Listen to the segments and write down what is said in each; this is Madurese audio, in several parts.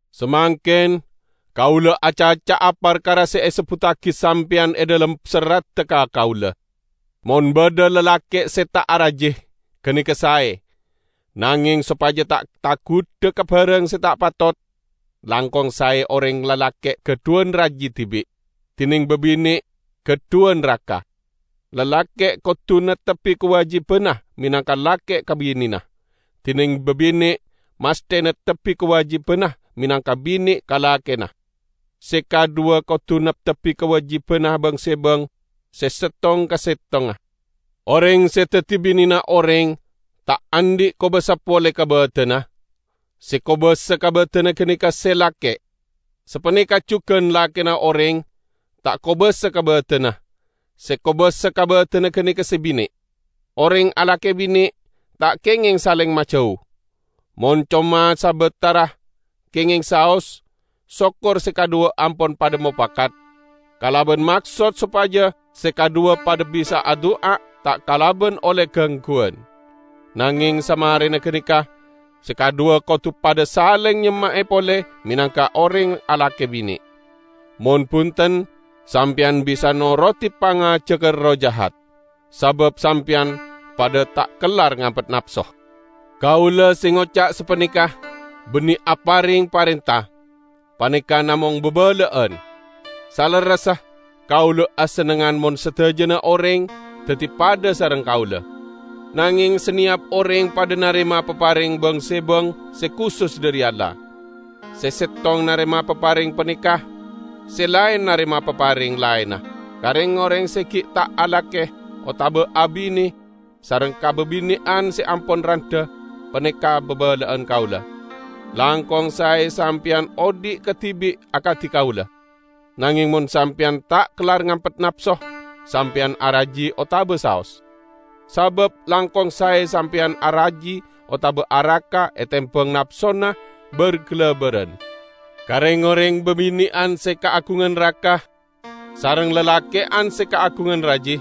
Samangken kaula acaca'a parkara se esebbuttagi sampeyan e dhalem serradda ka kaula. Mon badha lalake' se ta' araji, ganeka sae. Nangeng sopaja ta' tagudha ka barang se ta' patot, langkong sae oreng lalake' gadhuwan raji dibi', dineng babine' gadhuwan raka. Lalake' kodu neptebbi kawajibanna menangka lake ka binena; dineng babine' masthe neptebbi kawajibanna menangka bine ka lakena; se kadhuwa kodu neptebbi kawajibanna bang-sebang se settong ka settongnga. Oreng se daddi binena oreng ta' andhi' kobasa pole ka badanna; se kobasa ka badanna ganeka se lake'. Sapaneka jugan lakena oreng ta' kobasa ka badanna; se kobasa ka badanna ganeka se bine'. Oreng alake-bine ta' kengeng saleng majau. Mon coma sabatara, kengeng saos, sokor se kadhuwa ampon padha mopakat, kalaban maksod sopaja se kadhuwa padha bisa adu'a ta' kalaban olle gangguwan. Nangeng samarena ganeka, se kadhuwa kodu padha saleng nyemma'e pole menangka oreng alake-bine. Mon bunten, sampeyan bisa norodi pangajagga erroh jahat, sabab sampeyan padha ta' kellar ngampet napso. Kaula se ngoca' sapaneka banne apareng parenta; paneka namong babala'an. Salerressa kaula asennengngan mon sadajana oreng daddi padha sareng kaula. Nangeng saneyap oreng padha narema papareng bang-sebang se kusus dhari Allah. Se settong narema papareng paneka, se laen narema papareng laenna. Ka reng-oreng se gi' ta' alake otaba abine sareng ka babine'an se ampon randha, paneka' babala'an kaula: Langkong sae sampeyan odhi' kadibi' akadi kaula. Nangeng mon sampeyan t'a kellar ngampet napso, sampeyan araji otaba saos. Sabab langkong sae sampeyan araji otaba araka etembang napsona bar-galabaran. Ka reng-oreng babine'an se kaagungan raka sareng lalake'an se kaagungan raji,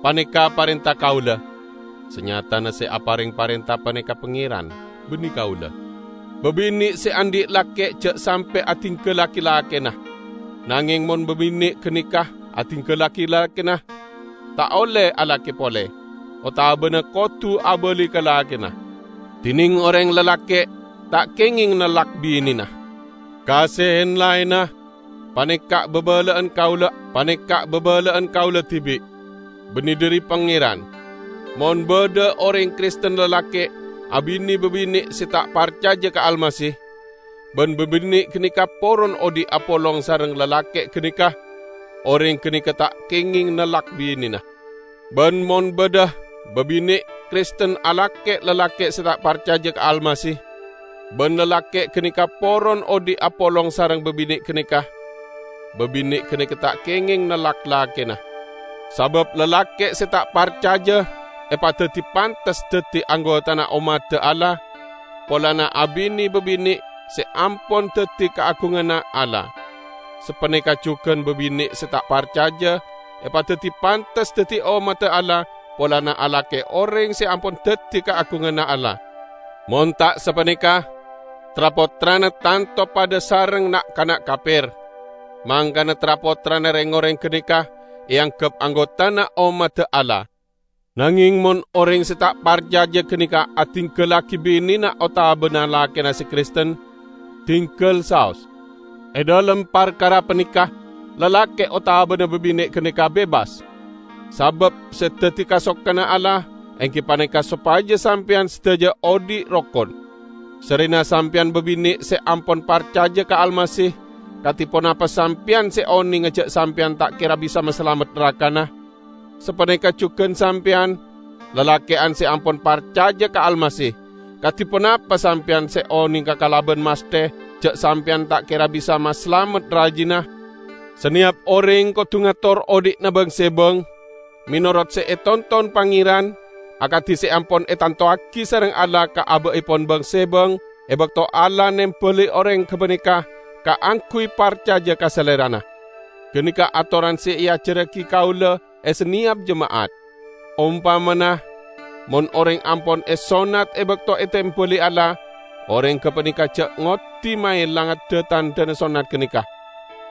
paneka' parenta kaula: (Sanyatana se apareng parenta paneka Pangeran, banne kaula.) Babine' se andhi' lake ja' sampe' adinggallagi lakena. Nangeng, mon babine' ganeka adinggallagi lakena, ta' olle alake pole, otabana kodu abali ka lakena. Dineng oreng lalake' ta' kengeng nellak binena. Ka se en-laenna, paneka' babala'an kaula: -- paneka babala'an kaula dibi', banne dhari Pangeran -- Mon badha oreng Kristen lalake' abine babine' se ta' parcaja ka Almasih, ban babine' ganeka poron odhi' apolong sareng lalake' ganeka, oreng ganeka ta' kengeng nellak binena. Ban mon badha babine' Kristen alake lalake' se ta' parcaja ka Almasih, ban lalake' ganeka poron odhi' apolong sareng babine' ganeka, babine' ganeka ta' kengeng nellak lakena. Sabab lalake' se ta' parcaja epadaddi pantes daddi anggotana ommadda Allah polana abine babine' se ampon daddi kaagunganna Allah. Sapaneka jugan babine' se ta' parcaja epadaddi pantes daddi ommadda Allah polana alake oreng se ampon daddi kaagunganna Allah. Mon ta' sapaneka, tra-pottrana tanto padha sareng na'-kana' kaper, mangkana tra'-pottrana reng-oreng ganeka eanggep anggotana ommadda Allah. Nangeng mon oreng se ta' parcaja ganeka adinggallagi binena otabana lakena se Kristen, dinggal saos. E dhalem parkara paneka, lalake' otabana babine' ganeka bebas, sabab se daddi kasokanna Allah enggi paneka sopaja sampeyan sadaja odhi' rokon. Sarrena sampeyan babine' se ampon parcaja ka Almasih, kadi ponapa sampeyan se onenga ja' sampeyan ta' kera bisa masalamet rakana? Sapaneka jugan sampeyan, lalake'an se ampon parcaja ka Almasih, kadi ponapa sampeyan se onenga kalaban masthe ja' sampeyan ta' kera bisa masalamet rajina? Saneyap oreng kodu ngator odhi'na bang-sebang menorot se etonton Pangeran akadi se ampon etantowagi sareng Allah ka aba'epon bang-sebang e bakto Allah nembali oreng gapaneka kaangguy parcaja ka Salerana. Ganeka atoran se eajarragi kaula e saneyap jema'at. Ompamana, mon oreng ampon esonnat e bakto etembali Allah, oreng gapaneka ja' ngoddi maelanga dha-tandhana sonnat ganeka.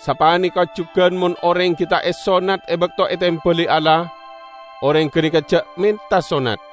Sapaneka jugan mon oreng gi' ta' esonnat e bakto etembali Allah, oreng ganeka ja' menta sonnat.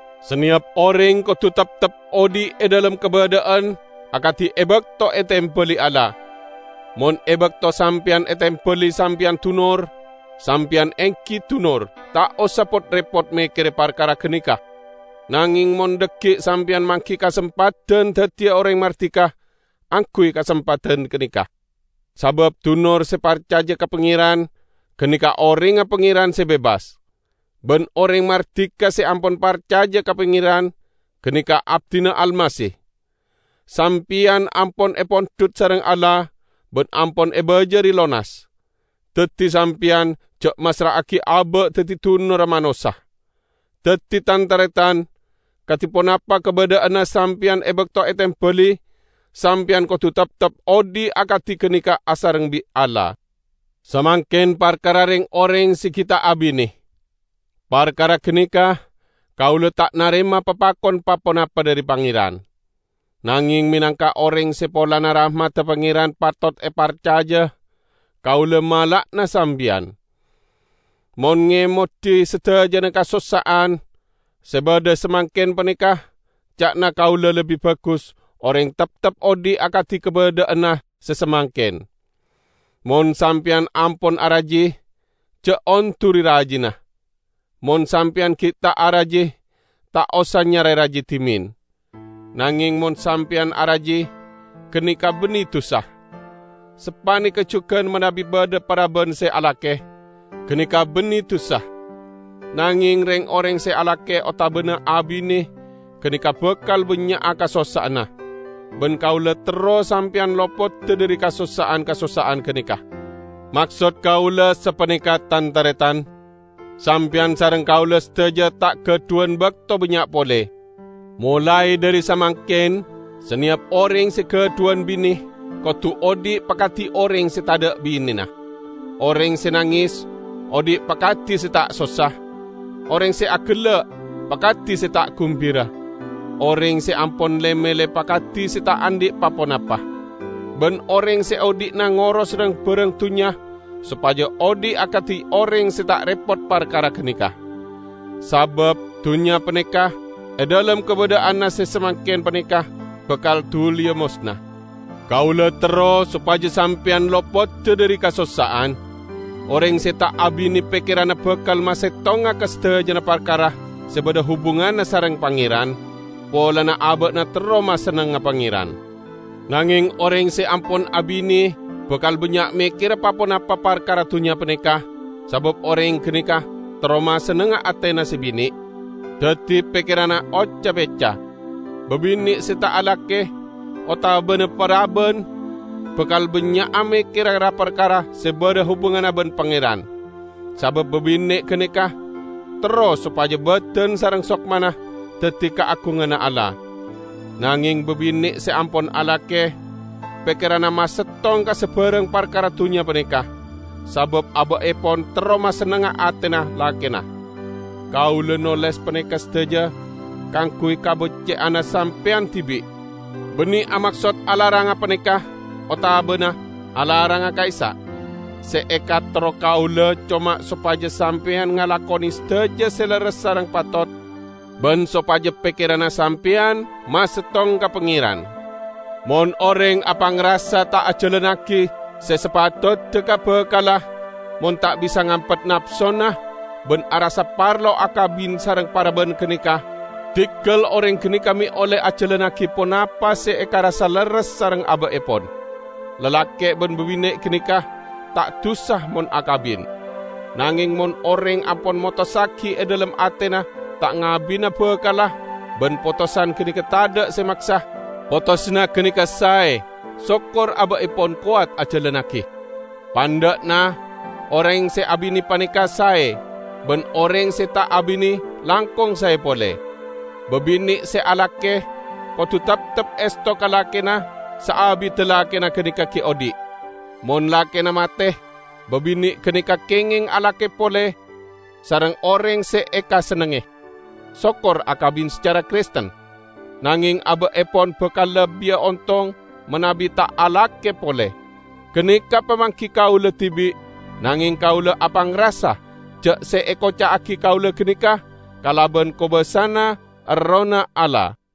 Saneyap oreng kodu teptep odhi' e dhalem kabadha'an akadi e bakto etembali Allah. Mon e bakto sampeyan etembali sampeyan dunor, sampeyan enggi dunor, ta' osa pot-repot mekkere parkara ganeka. Nangeng mon dhaggi' sampeyan manggi kasempadan daddiya oreng mardika, angguy kasempadan ganeka. Sabab dunor se parcaja ka Pangeran, ganeka orengnga Pangeran se bebas. Ban oreng mardika se ampon parcaja ka Pangeran, ganeka abdina Almasih. Sampeyan ampon epondhut sareng Allah ban ampon ebajari lonas. Daddi sampeyan ja' massra'agi aba' daddi dunorra manossa. Daddi, tan-taretan, kadi ponapa kabadha'anna sampeyan e bakto etembali, sampeyan kodu teptep odhi' akadi ganeka asareng bi' Allah. Samangken parkara reng-oreng se gi' ta' abine. Parkara ganeka kaula ta' narema papakon pa-ponapa dhari Pangeran. Nangeng menangka oreng se polana rahmadda Pangeran patot eparcaja, kaula mala'ana sampeyan. Mon ngemodi sadajana kasossa'an se badha samangken paneka, ca'na kaula lebbi bagus oreng teptep odhi' akadi kabadha'anna se samangken. Mon sampeyan ampon araji, ja' onduri rajina. Mon sampeyan gi' ta' araji, ta' osa nyare raji dhimen. Nangeng mon sampeyan araji, ganeka banne dusa. Sapaneka jugan manabi badha paraban se alake, ganeka banne dusa. Nangeng, reng-oreng se alake otaba abine ganeka bakal bannya'a kasossa'anna. Ban kaula terro sampeyan lopoda dhari kasossa'an-kasossa'an ganeka. Maksod kaula sapaneka, tan-taretan: Sampeyan sareng kaula sadaja ta' gadhuwan bakto bannya' pole. Molae dhari samangken, saneyap oreng se gadhuwan bine kodu odhi' pakadi oreng se tadha' binena; oreng se nanges, odhi' pakadi se ta' sossa; oreng se agella' pakadi se ta' gumbira; oreng se ampon le-melle pakadi se ta' andhi' pa-ponapa; ban oreng se odhi'na ngoros rang-barang dunnya sopaja odhi' akadi oreng se ta' repot parkara ganeka. Sabab dunnya paneka, e dhalem kabadha'anna se samangken paneka, bakal duliya mosna. Kaula terro sopaja sampeyan lopoda dhari kasossa'an. Oreng se ta' abine pekkeranna bakal masettonga ka sadajana parkara se badha hubunganna sareng Pangeran, polana aba'na terro masennengnga Pangeran. Nangeng oreng se ampon abine bakal bannya' mekkere pa-ponapa parkara dunnya paneka, sabab oreng ganeka terro masennengnga atena se bine'; daddi pekkeranna oca-pecca. Babine' se ta' alake, otabana paraban, bakal bannya'a mekkere ra-parkara se badha hubunganna ban Pangeran, sabab babine' ganeka terro sopaja badan sareng sokmana daddi kaagunganna Allah. Nangeng babine' se ampon alake, pekkeranna masettong ka sabarang parkara dunnya paneka, sabab aba'epon terro masennengnga atena lakena. Kaula noles paneka sadaja kaangguy kabecce'anna sampeyan dibi', banne amaksod alaranga paneka otabana alaranga ka'issa'. Se ekaterro kaula coma sopaja sampeyan ngalakone sadaja se lerres sareng patot, ban sopaja pekkeranna sampeyan masettong ka Pangeran. Mon oreng apangrasa ta' ajalannagi se sapatodda ka bakalla, mon ta' bisa ngampet napsona, ban arassa parlo akabin sareng paraban ganeka, diggal oreng ganeka me' olle ajalannagi ponapa se ekarassa lerres sareng aba'epon. Lalake' ban babine' ganeka ta' dusa mon akabin. Nangeng mon oreng ampon motossagi e dhalem atena ta' ngabina bakalla, ban potosan ganeka tadha' se maksa, potosanna ganeka sae, sokor aba'epon kowat ajalannagi. Pandha'na, oreng se abine paneka sae, ban oreng se ta' abine langkong sae pole. Babine' se alake kodu teptep esto ka lakena saabidda lakena ganeka gi' odhi'. Mon lakena mate, babine' ganeka kengeng alake pole sareng oreng se ekasennengnge; sokor akabin sacara Kristen. Nangeng aba'epon bakal lebbiya ontong manabi ta' alake pole. Ganeka pamanggi kaula dibi', nangeng kaula apangrasa ja' se ekoca'agi kaula ganeka kalaban kobasana Errohna Allah.